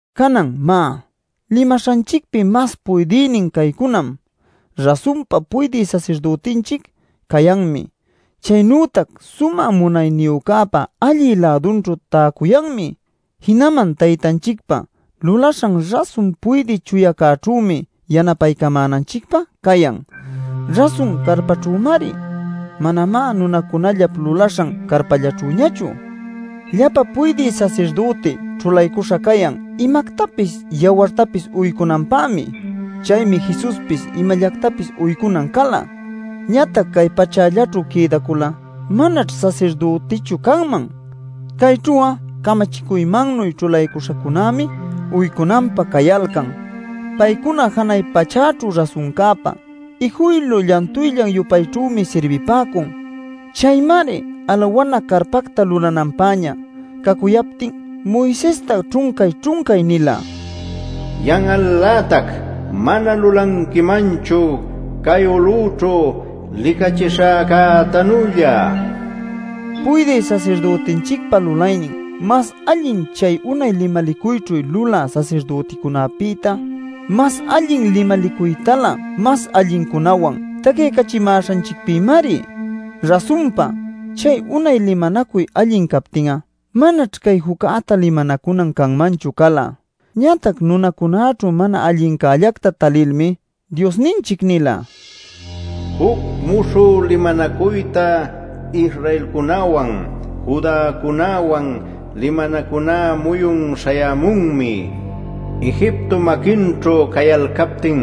Canan, má, limaśhanchicpi mas puydïnin caycunam: rasunpa puydï sasirdütinchic cayanmi. Chaynütac Sumä Munayniyücäpa allï-lädunćhu täcuyanmi. Jinaman Taytanchicpa lulaśhan rasun puydï chuyacäćhümi yanapaycamänanchicpä cayan; rasun carpaćhümari, manamá nunacunallap lulaśhan carpallaćhüñachu. Llapa puydï sasirdüti ćhulaycuśha cayan imactapis yawartapis uycunanpämi. Chaymi Jesuspis imallactapis uycunan cala. Ñatac cay pachällaćhu quïdacul'a manaćh sasirdütichu canman. Cayćhu'a camachicuymannuy ćhulaycuśhacunämi uycunanpä cayalcan. Paycuna janay pachäćhu rasuncäpa ijuylu llantuyllan-yupayćhümi sirbipäcun. Chaymari alawana carpacta lulananpäña cacuyaptin Moisesta ćhuncay-ćhuncay nila: “Yan'al-lätac mana lulanquimanchu cay ulüćhu licachishäcätanülla” nil. Puydï Sasirdütinchicpa lulaynin mas allin chay unay limalicuyćhu lulä sasirdüticunapïtá mas allin limalicuytalä mas allincunawan tacyaycachimäśhanchicpïmari. Rasunpa, chay unay limanacuy allin captin'a, manaćh cay juccäta limanacunan canmanchu cala. Ñatac nunacunäćhu mana allincällacta talilmi Diosninchic nila: “Juc muśhü limanacuyta Israelcunäwan, Judäcunäwan limanacuná muyun śhayämunmi. Egiptop maquinćhu cayalcaptin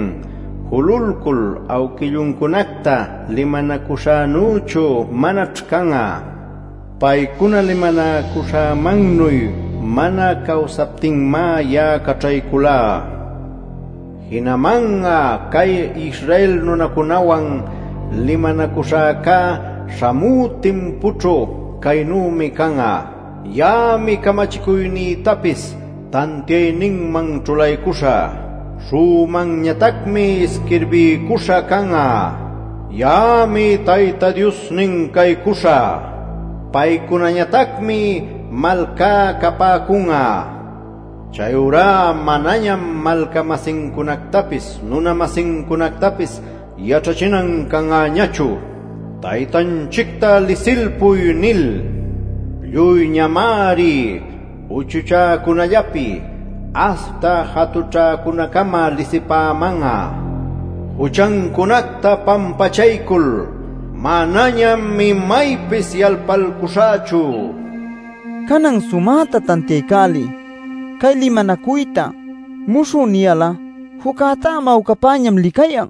jululcul awquilluncunacta limanacuśhänüchu manaćh can'a. Paycuna limanacuśhämannuy mana cawsapäcuptinmá ya'a caćhayculá. Jinaman'a cay Israel nunacunäwan limanacuśhäca śhamü timpućhu caynümi can'a: ya'ami camachicuynïtapis tantiayninman ćhulaycuśhä, śhun'unmanñatacmi isquirbiycuśha can'a. Ya'ami Tayta Diosnin caycuśhä; paycunañatacmi malcá capäcun'a. Chayurá manañam malca-masincunactapis nuna-masincunactapis yaćhachinan can'añachu ‘Taytanchicta lisilpuy’ nil. Lluyñamari uchuchäcunällapi aśhta jatućhäcunäcama lisipäman'a. Juchancunacta pampachaycul manañam imaypis yalpalcuśhächu” nil. Canan sumäta tantiaycäliy: Cay limanacuyta “muśhü” niyal'a, juccätá mawcapäñam licayan.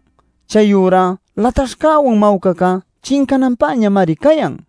Chayurá lataśhcäwan mawcacá chincananpäñamari cayan.